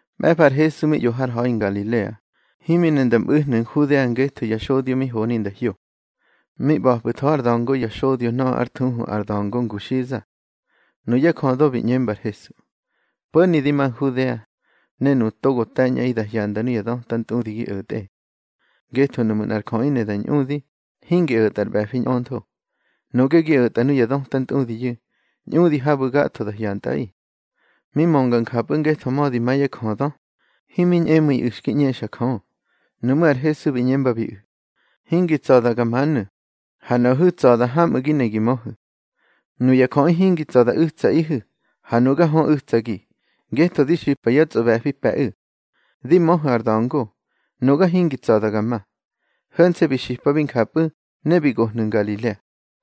Mꞌe̱fa ar Hesu mi ꞌyo har ha̱i Ngalilea, himi ne nda mꞌu̱hnu̱ Nhudea ngetho ya xodyo mi honi nda hyo. Mi ꞌba̱pꞌu̱tho ár da̱ngo ya xodyo nöꞌö ár thuhu, ar da̱ngo nguxiza. Nuyá jödö bi ꞌñemba ar Hesu: —Po̱ni di ma Nhudea, ne nuꞌu̱ togo te̱ñꞌaꞌi da hyanda nuya döta ntꞌudi gi o̱tꞌe. Ngetho nuꞌmu̱ nꞌar jöꞌi ne da ñꞌudi, hingi o̱tꞌa ar ꞌbe̱fi ñꞌöntho. Nuꞌge gi o̱tꞌa nuya döta ntꞌudiyu̱, ñꞌudi habu̱ gatho da hyantꞌaꞌi. Mi mönga njapꞌu̱ ngetho mödi ma yá jödö, himi ñꞌemu̱iꞌu̱ xki ꞌñexa Jö. Nuꞌmú̱ ar Hesu bi ꞌñembabiꞌu̱: —Hingi tsa̱da ga manu̱, ha nuꞌahu̱ tsa̱da hamꞌu̱ gi ne gi möhu̱. Nuya jöꞌi hingi tsa̱ da u̱tsaꞌihu̱, ha nuga hö u̱tsagi, ngetho di xipa yá tsꞌoꞌbe̱fi pe̱ꞌu̱. Di möhu̱ ar da̱ngo. Nuga hingi tsa̱da ga ma. Ho̱nse̱ bi xipabi njapꞌu̱, ne bi gohnu̱ Ngalilea.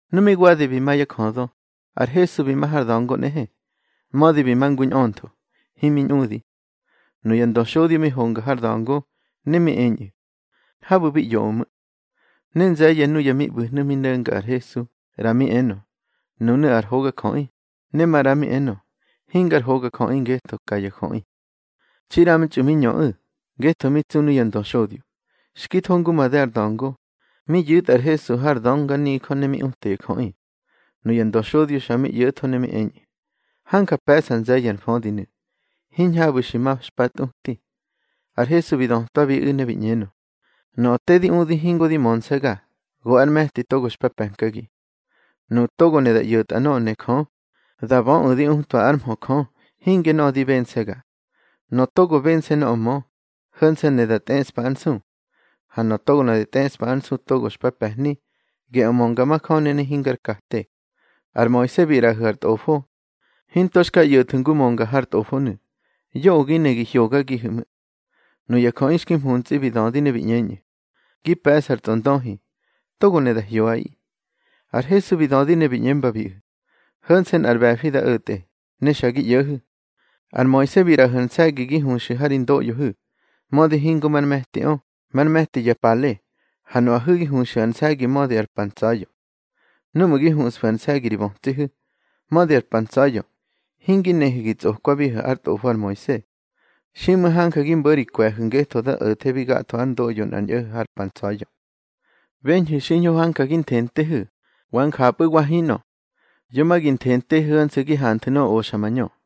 Nu mi wadi bi ma yá jödö, ar Hesu bi ma har da̱ngo nꞌehe, mödi bi ma ngu ñꞌöntho, himi ñꞌudi. Nuya ndöxodyo mi honga har da̱ngo, ne mi eñꞌu̱: —Habu̱ bi ꞌyoꞌö ꞌmu̱. Ne nze̱ye̱ nuya mi ꞌbu̱hnu̱ mi no̱nga ar Hesu, ꞌra mi enö: Nunu̱ ar hogajöꞌi, ne maꞌra mi enö: Hingar hogajöꞌi, ngetho ka ya jöꞌi. Txi ꞌramtxꞌu̱ mi ñöꞌu̱, ngetho mi tsu nuya ndöxodyo. Xki tho ngu made ar da̱ngo, mi yu̱tꞌa ar Hesu har dönganijö ne mi uta ya jöꞌi. Nuya ndöxodyo xa mi ꞌyo̱tho ne mi eñꞌu̱: —Hanja pe̱ꞌsa nze̱ye̱ ar mfödinu̱, hiñhabu̱ xi ma xpa tꞌuti. Ar Hesu bi dötwabiꞌu̱ ne bi ꞌñenö: —Nöꞌö te di udi hingo di mönse̱ga, go ár me̱ti togo xpa pe̱nkagi. Nuꞌu̱ togo ne da ꞌyo̱tꞌa nöꞌö ne Jö, da böꞌu̱ di utwa ár mhö Jö, hinge nöꞌö di bense̱ga. Nöꞌö togo bense̱ nöꞌö mö, ho̱nse̱ ne da tꞌeꞌspa ár nsu. Ha nöꞌö togo ne da tꞌeꞌspa ár nsu togo xpa pe̱hni, geꞌö mönga majöni ne hingar kate. Ar Moise bi ꞌraꞌahu̱ ar tꞌofo. Hinto xka ꞌyo̱thu̱ ngu mönga har tꞌofonu̱. Yoꞌö gi ne gi hyogagihu ꞌmu̱. Nuya jöꞌi xki mhuntsꞌi bi dödi ne bi ꞌñeñꞌu̱: —Gi pe̱ꞌsa ar tsꞌondöhi. Togo ne da hyoꞌaꞌi. Ar Hesu bi dödi ne bi ꞌñembabiꞌu̱: —Ho̱nse̱ nꞌar ꞌbe̱fi da o̱tꞌe, ne xa gi ꞌyo̱hu̱. Ar Moise bi ꞌraꞌahu̱ ar nse̱gi gi huxu̱ ha ri ndoꞌyohu̱, mödi hingo mar me̱tiꞌö, már me̱ti ya pale. Ha nuꞌahu̱ gi huxu̱ ar nse̱gi mödi ar pa ntsa̱ya̱. Núꞌmu̱ gi huꞌsfu̱ ar nse̱gi ri bötsihu̱, mödi ar pa ntsa̱ya̱, hingi nehu̱ gi tsꞌokwabihu̱ ár tꞌofo ar Moise. Xiꞌmu̱ hanja gi mbo̱ ri kwe̱hu̱ ngetho da o̱thebi gatho ár ndoꞌyo nꞌar ñꞌo̱ho̱ har pa ntsa̱ya̱. Beñhu̱ xiñho hanja gi nthentehu̱, wa njapꞌu̱ wa hinꞌö. Yo ma gi nthentehu̱ ho̱nse̱ gi hanthu̱ nöꞌö oxa mañö.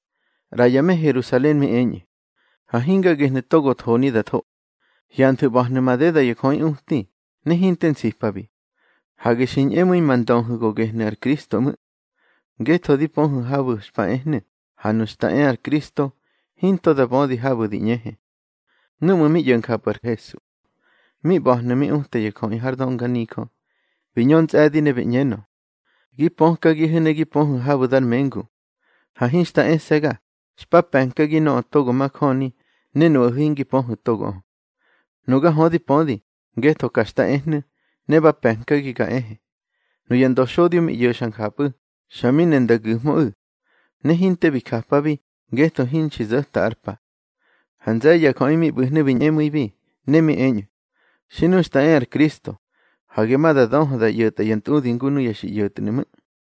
ꞌRa ya me Herusalen mi eñꞌu̱: —Ha hinga gehnu̱ togo thoni da tho. Hyanthu̱ ꞌba̱hnu̱ madeda ya jöꞌi uti, ne hinte nsipabi. Hage xi ñꞌemu̱i ma ndöhu̱ go gehnu̱ ar Kristo ꞌmu̱. Ngetho di pöhu̱ habu̱ xpa ehnu̱, ha nu xta e ar Kristo, hinto ma da bödi habu̱ di ꞌñehe. Núꞌmu̱ mi ꞌyo̱ njapꞌu̱ ar Hesu, mi ꞌba̱hnu̱ mi uta ya jöꞌi har dönganijö, bi ñö ntsꞌe̱di ne bi ꞌñenö: —Gi pökagihu̱ ne gi pöhu̱ habu̱ dar mengu. Ha hinxta ese̱ga, xpa pe̱nkagi nöꞌö togo majöni, ne nuꞌahu̱ hingi pöhu̱ togoꞌö. Nuga hö di pödi, ngetho ka xta ehnu̱, ne ba pe̱nkagi ga ehe. Nuya ndöxodyo mi ꞌyo̱xa njapꞌu̱, xa mi ne nda gu̱hmöꞌu̱. Ne hinte bi japabi, ngetho hinxki zo̱ta ár pa. Ha nze̱ye̱ ya jöꞌi mi ꞌbu̱hnu̱ bi ñꞌemu̱ibi, ne mi eñꞌu̱: —Xi nu xta e ar Kristo, hage ma da döhö da ꞌyo̱tꞌa ya ntꞌudi ngu nuya xi ꞌyo̱tnu̱ ꞌmu̱.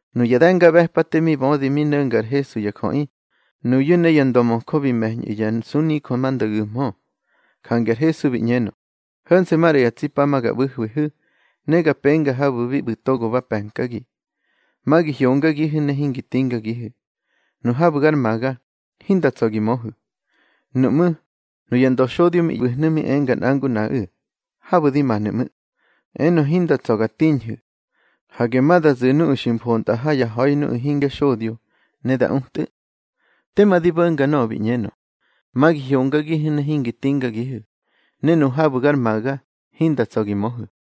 Nuya de̱ngaꞌbe̱pate mi bödi mi no̱nga ar Hesu ya jöꞌi, nuyu̱ ne ya ndömöjö bi me̱ñꞌu̱ ya nsunijö ma nda gu̱hmö. Jange ar Hesu bi ꞌñenö: —Ho̱nse̱ maꞌra ya tsi pa ga ꞌbu̱hwihu̱, ne ga penga habu̱ bi ꞌbu̱ togo ba pe̱nkagi. Ma gi hyongagihu̱ ne hingi tingagihu̱. Nu habu̱ gar maga, hinda tsa̱ gi möhu̱. Nuꞌmú̱, nuya ndöxodyo mi ꞌbu̱hnu̱ mi enga nꞌa ngu nꞌaꞌu̱: —Habu̱ di manu̱ ꞌmu̱, enö hinda tsa̱ ga tiñhu̱. Hage ma da zu̱ nuꞌu̱ xi mfontꞌa ha yá ha̱i nuꞌu̱ hingya xodyo, ne da utꞌu̱. Tema di bo̱nga nöꞌö bi ꞌñenö: Ma gi hyongagihu̱ ne hingi tingagihu̱, ne nu habu̱ gar maga, hinda tsa̱ gi möhu̱.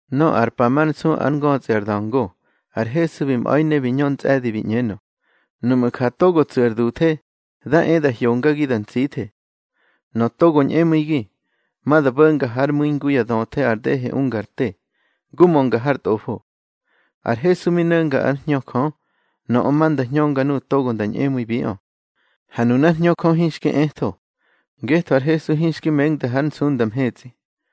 Nöꞌö ar pa mar nsu ár ngötsꞌi ar da̱ngo, ar Hesu bi mꞌa̱i ne bi ñö ntsꞌe̱di bi ꞌñenö: —Nuꞌmu̱ ja togo tsu̱ ar duthe, da e da hyongagi da ntsithe. Nöꞌö togo ñꞌemu̱igi, ma da bo̱nga hár mu̱i ngu ya döthe ar dehe unga ar te, ngu mönga har Tꞌofo. Ar Hesu mi no̱nga ár Hñö Jö, nöꞌö ma nda hñönga nuꞌu̱ togo nda ñꞌemu̱ibiꞌö. Ha nunár Hñö Jö hinxki etho, ngetho ar Hesu hinxki mengda hár nsunda mhetsꞌi.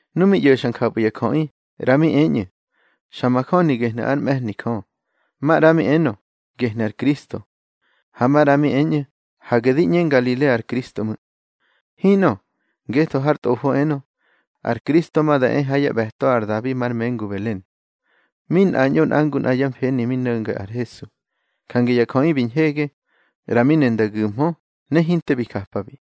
Nu mi ꞌyo̱xa njapꞌu̱ ya jöꞌi, ꞌra mi eñꞌu̱: —Xa majöni gehnu̱ ár mꞌe̱hni Jö. Maꞌra mi enö: —Gehnu̱ ar Kristo. Ha maꞌra mi eñꞌu̱: —Hage di ꞌñe Ngalilea ar Kristo ꞌmu̱. Hinꞌö, ngetho har Tꞌofo enö, ar Kristo ma nda e ha yá ꞌbe̱to ar Dabi mar mengu Belen. Mi nꞌañꞌo nꞌa ngu nꞌa yá mfeni mi no̱nga ar Hesu, jange ya jöꞌi bi ñhege. ꞌRa mi ne nda gu̱mhö, ne hinte bi japabi.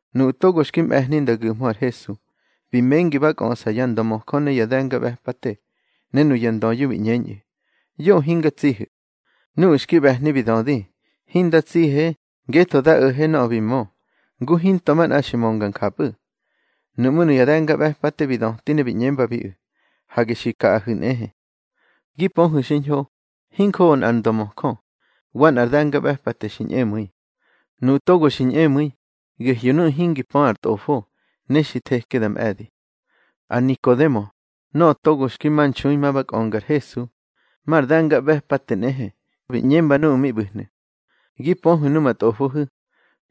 Nuꞌu̱ togo xki mꞌe̱hni nda gu̱hmö ar Hesu, bi mengi ma ba kꞌöꞌsa ya ndömöjö ne ya de̱ngaꞌbe̱pate. Ne nuya ndöyu̱ bi ꞌñeñꞌu̱: —Yoꞌö hinga tsihu̱. Nuꞌu̱ xki ꞌbe̱hni bi dödi: —Hinda tsihe, ngetho da o̱he nöꞌö bi mö, ngu hinto manꞌa xi mönga njapꞌu̱. Nuꞌmú̱ nuya de̱ngaꞌbe̱pate bi döti ne bi ꞌñembabiꞌu̱: —Hage xi kaꞌahu̱ nꞌehe. Gi pöhu̱ xiñho, hinjoꞌo nꞌar ndömöjö, wa nꞌar de̱ngaꞌbe̱pate xi ñꞌemu̱i. Nuꞌu̱ togo xi ñꞌemu̱i, gehyu̱ nuꞌu̱ hingi pö ar tꞌofo, ne xi theke da mꞌe̱di. Ar Nikodemo, nöꞌö togo xki ma nxui ma ba kꞌönga ar Hesu, mar de̱ngaꞌbe̱pate nꞌehe, bi ꞌñemba nuꞌu̱ mi ꞌbu̱hnu̱: —Gi pöhu̱ numa tꞌofohu̱,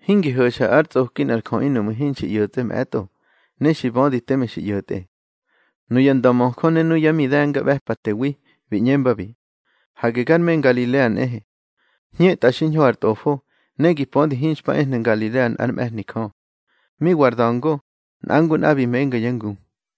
hingi ho̱xa ár tsꞌoki nꞌar jöꞌi nuꞌmu̱ hinxi ꞌyo̱tsꞌe mꞌe̱tꞌo, ne xi bödi teme xi ꞌyo̱tꞌe. Nuya ndömöjö ne yá mi de̱ngaꞌbe̱patewi bi ꞌñembabi: —Hage gar me Ngalilea nꞌehe. Hñetꞌa xiñho ar Tꞌofo, ne gi pödi hinxpa ehnu̱ Ngalilea nꞌár mꞌe̱hni Jö. Mi wa ar da̱ngo, nꞌa ngu nꞌa bi menga yá ngu.